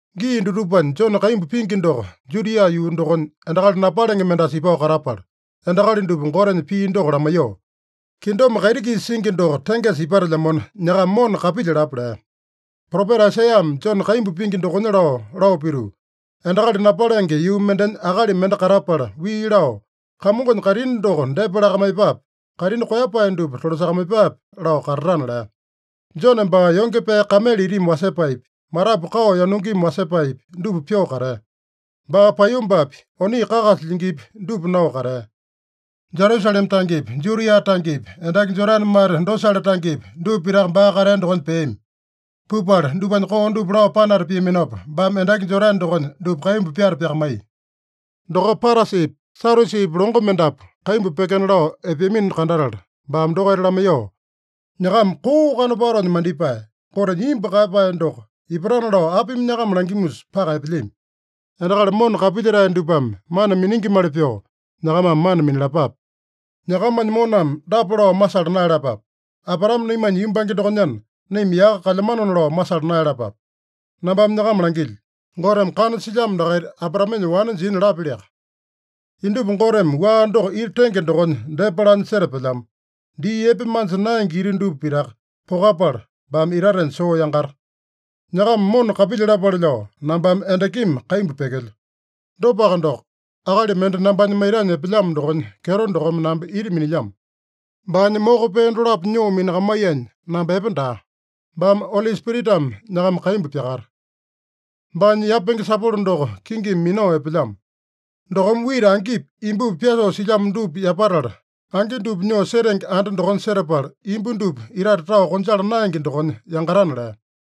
Gii dutupanya Jone kaimbu pingi doko Judia yuu dokonya, endakali napalenge mendasa ipao katapala, endakali dupa Gotenya pii doko lamaiyoo, “Kingdom kaiti-kisa singi doko tengesa ipatelyamona, nyakama mona kapilyalapa” lea. Propeta Aisaiyame Jone kaimbu pingi dokonya lao, lao pituu, “Endakali napalenge yuu mendenya akali mende katapala wii lao, ‘Kamongonya kaitini doko depa lakamaiyepape. Kaitini koeyapae dupa tolasakamaiyepape’ lao katatana” lea. Jone baa yonge pee kamele itimi wasepaepi, matapu kao yanungimi wasepaepi, dupa pyoo katea. Baa paiyombapi, oni kakasa lyingipi, dupa nao katea. Jerusalema tangepi, Judia tangepi, endaki Jodane mate dosale tangepi, dupa pitaka baa katea dokonya peami. Pupala dupanya koo dupa lao panata piaminopa, baame endaki Jodane dokonya dupa kaimbu pyata pyakamaiya. Dokopa Parasipi, Sadyusipi longo mendapu kaimbu pyekena lao epeamino kandatala, baame dokaita lamaiyoo, “Nyakama koo kanopatonya mandipae! Gotenya imbu kaeyapae doko ipatana lao apimi nyakama langimusa paka epelyami? Endakali mona kapilyetae dupame mana miningimali pyoo, nyakamame mana minalapape. Nyakamanya moname dapa lao masala naeyalapape: ‘Abraame naimanya yumbange dokonyana, naima yaka kalyamanona’ lao masala naeyalapape. Nambame nyakama langilyo: Goteme kana silyamo dakaita Abraamenya wane jina lapyaliaka. Indupa Goteme wua doko ita tenge dokonya depa lanya setapelyamo. Dii epe manja naenge ita dupa pitaka pokapala, baame itatenya soo yangata. “Nyakama mona kapilyalapale lao nambame endakimi kaimbu pyekelyo. Dopaka doko, akali mende nambanya maitanya epelyamo dokonya kyeto dokome namba ita minilyamo. Baanya moko pee dolapo nyoo minakamaiyanya, namba epe daa. Baame Oli Spiritame nyakama kaimbu pyakata. Baanya yapenge sapolo doko kingimi minao epelyamo. Dokome wita angipi, imbupi pyasoo silyamo dupa yapatala, angi dupa nyoo setenge anda dokonya setapala, imbu dupa itate tao konjala naenge dokonya yangatana” lea.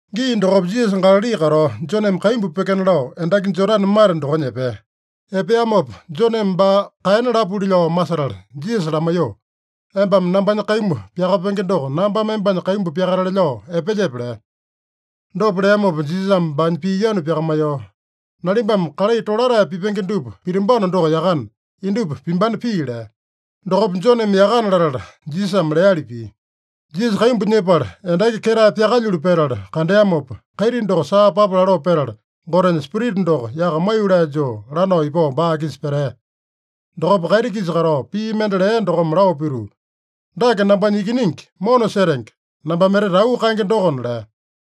Gii dokopa Jisasa Galali katao, Joneme kaimbu pyekena lao endaki Jodane mate dokonya epea. Epeamopa, Joneme baa kaena lapuli lao masetala Jisasa lamaiyoo, “Embame nambanya kaimbu pyakapenge doko, nambame embanya kaimbu pyakatale lao epelyepe?” lea. Dopa leamopa Jisasame baanya pii yanu pyakamaiyoo, “Nalimbame kalai tolatae pipenge dupa pitambano doko yakana, indupa pimbana pii” lea. Dokopa Joneme yakana latala, Jisasame leali pia. Jisasa kaimbu nyepala, endaki ketae pyakalyulu petala kandeamopa, kaiti doko saa papa laloo petala, Gotenya Spirita doko yaka maiyolee joo lanao ipao baa-kisa petea. Dokopa kaiti-kisa katao pii mende lea dokome lao pituu, “Dake nambanya Ikiningi mona setenge, nambame etete auu kaenge dokona” lea.